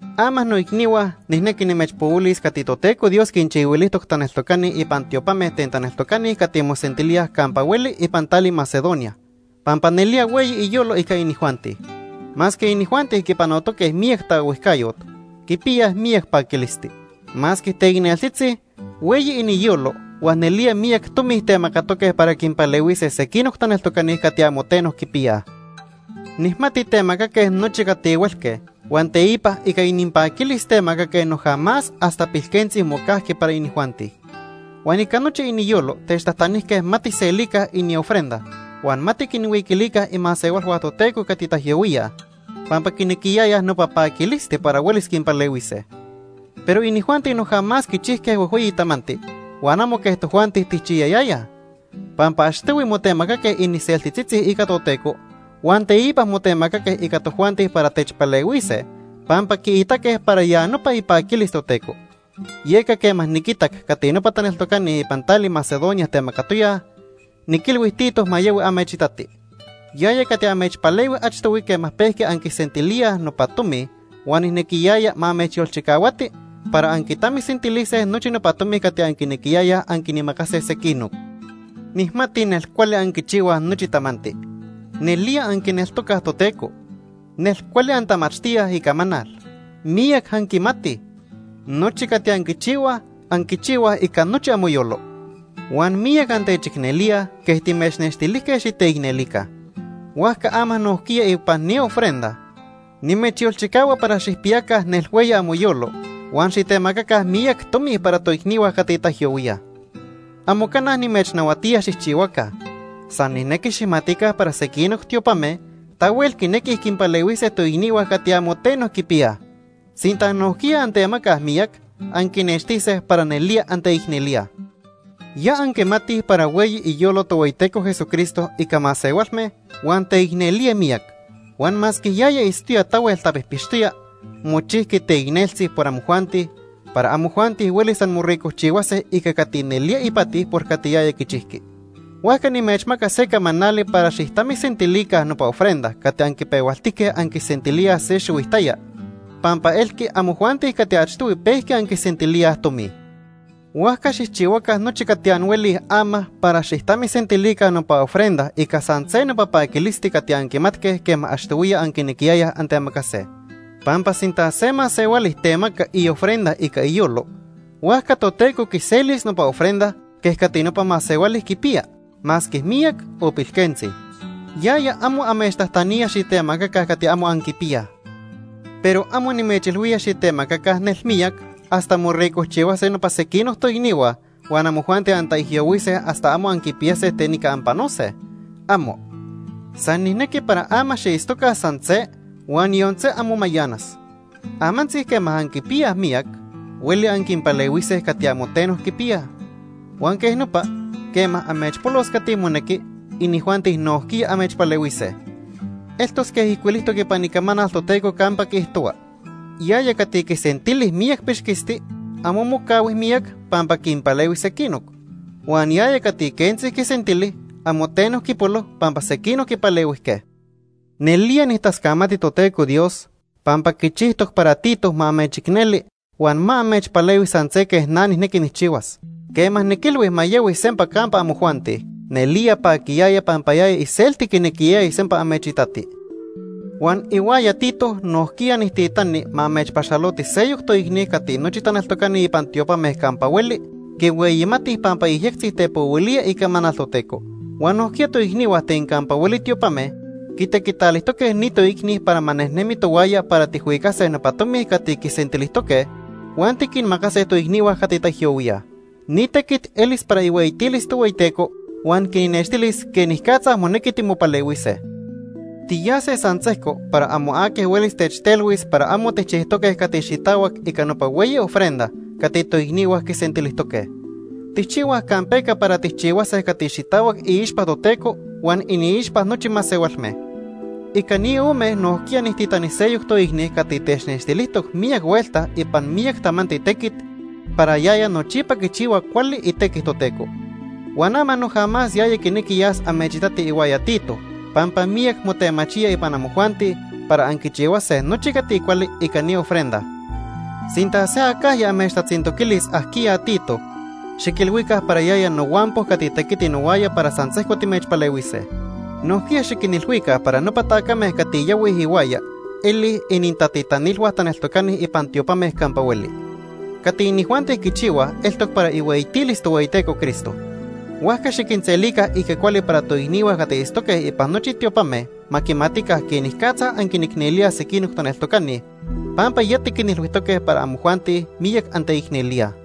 Ama noicnihua nijnequi nimechpohuilis cati Toteco Dios quinchihuilijtoc taneltocani ipan tiopame ten taneltocani cati mosentilíaj campa hueli ipan tali Macedonia, pampa nelía hueyi iyolo ica inijuanti. Masque inijuanti quipanotoque miyac taohuijcayot, quipiyaj miyac paquilisti. Masque teicneltzitzi, hueyi iniyolo huan nelía miyac tomi temacatoque para quinpalehuise sequinoc taneltocani cati amo teno quipiyaj. Nijmati temacaque nochi cati huelque huan teipa ica ininpaquilis temacaque noja más hasta pilquentzi mocajqui para inijuanti. Huan ica nochi iniyolo techtajtanijque ma tijselica iniofrenda huan ma tiquinhuiquilica imasehualhua Toteco cati taijyohuíaj pampa quinequiyayaj nopa paquilisti para huelis quinpalehuise. Pero inijuanti noja más quichijque huejhueyi tamanti huan amo quej tojuanti tijchiyayayaj. Pampa achtohui motemacaque iniseltitzitzi ica Toteco huan teipa motemacaque ica tojuanti para techpalehuise pampa quiitaque para ya nopa ipaquilis Toteco. Yeca quema niquitac cati nopa taneltocani ipan tali Macedonia temacatoyaj, niquilhui Tito ma yahui amechitati. Yaya cati amechpalehui achtohui quema pejqui anquisentilíaj nopa tomi huan nijnequiyaya ma amechyolchicahuati para anquitamisentilise nochi nopa tomi cati anquinequiyayaj anquinmacase sequinoc. Nijmati nelcuali anquichihuaj nochi tamanti. Nelía anquineltocaj Toteco. Nelcuali antamachtíaj Icamanal. Miyac anquimatij. Nochi cati anquichihuaj, anquichihuaj ica nochi amoyolo. Huan miyac antechicnelíaj quej timechnextilijque xiteicnelica. Huajca ama nojquiya ipan ni ofrenda, nimechyolchicahua para xijpiyaca nelhueyi amoyolo huan xitemacaca miyac tomi para toicnihua cati taijyohuíaj. Amo cana nimechnahuatía xijchihuaca. San nijnequi xijmatica para sequinoc tiopame tahuel quinequij quinpalehuise toicnihua cati amo teno quipiyaj. Sinta nojquiya antemacaj miyac, anquinextise para nelía anteicnelíaj. Ya anquimatij para hueyi iyolo Tohueyiteco Jesucristo ica masehualme huan teicnelía miyac, huan masque yaya itztoya tahuel tapijpixtoya, mochijqui teicneltzi por amojuanti, para amojuanti huelis anmoricojchihuase ica cati nelía ipati por cati yaya quichijqui. Huajca nimechmaca se camanali para xijtamisentilica nopa ofrenda cati anquipehualtijque anquisentilíaj se xihuitaya, pampa elqui amojuanti cati achtohui pejqui anquisentilíaj tomi. Huajca xijchihuaca nochi cati anhuelij ama para xijtamisentilica nopa ofrenda ica san se nopa paquilisti cati anquimatque quema achtohuiya anquinequiyayaj antemacase. Pampa sinta se masehuali temaca iofrenda ica iyolo, huajca Toteco quiselis nopa ofrenda quej cati nopa masehuali quipiya, masque miyac o pilquentzi. Yaya amo amechtajtanía xitemacaca cati amo anquipiyaj. Pero amo nimechilhuía xitemacaca nelmiyac hasta moricojchihuase nopa sequinoc toicnihua huan amojuanti antaijyohuise hasta amo anquipiyase ten ica anpanose. ¡Amo! San nijnequi para ama xiitztoca san se huan yon se amo mayanas. Amantzi quema anquipiyaj miyac, hueli anquinpalehuise cati amo teno quipiyaj. Huan quej nopa, quema amechpolos cati monequi, inijuanti nojquiya amechpalehuise. Eltos quej ijcuilijtoc ipan Icamanal Toteco campa quiijtohua: “Yaya cati quisentili miyac pixquisti, amo mocahui miyac pampa quinpalehui sequinoc. Huan yaya cati quentzi quisentili, amo teno quipolo pampa sequinoc quipalehuijque.” Nelía nijtascamati Toteco Dios, pampa quichijtoc para Tito ma amechicneli huan ma amechpalehui san se quej na nijnequi nijchihuas. Quema niquilhui ma yahui sempa campa amojuanti, nelía paquiyaya pampa yaya iselti quinequiyaya sempa amechitati. Huan ihuaya Tito nojquiya nijtitani ma amechpaxaloti seyoc toicni cati nochi taneltocani ipan tiopame campa hueli quihueyimatij pampa yejyectzi tepohuilía icamanal Toteco. Huan nojquiya toicnihua ten campa hueli tiopame quitequitalijtoque ni toicni para ma nejnemi tohuaya para tijhuicase nopa tomi cati quisentilijtoque huan tiquinmacase toicnihua cati taijyohuíaj. Ni tequit elis para ihueyitilis Tohueyiteco huan quinnextilis quenicatza monequi timopalehuise. Tiyase san sejco para amo aqui huelis techtelhuis para amo tijchijtoque cati xitahuac ica nopa hueyi ofrenda cati toicnihua quisentilijtoque. Tijchihuaj campeca para tijchihuase cati xitahuac iixpa Toteco huan iniixpa nochi masehualme. Ica ni ome nojquiya nijtitani seyoc toicni cati technextilijtoc miyac huelta ipan miyac tamanti tequit para yaya nochipa quichihua cuali itequi Toteco. Huan ama noja más yaya quinequi yas amechitati ihuaya Tito pampa miyac motemachía ipan amojuanti para anquichihuase nochi cati cuali ica ni ofrenda. Sinta se acajya amechtatzintoquilis ajquiya Tito, xiquilhuica para yaya nohuampo cati tequiti nohuaya para san sejco timechpalehuise. Nojquiya xiquinilhuica para nopa tacame cati yahuij ihuaya elij inintatitanilhua taneltocani ipan tiopame campa hueli. Cati inijuanti quichihuaj eltoc para ihueyitilis Tohueyiteco Cristo. Huajca xiquinselica ica cuali para toicnihua cati itztoque ipan nochi tiopame ma quimatica quenicatza anquinicnelíaj sequinoc taneltocani, pampa ya tiquinilhuijtoque para amojuanti miyac anteicnelíaj.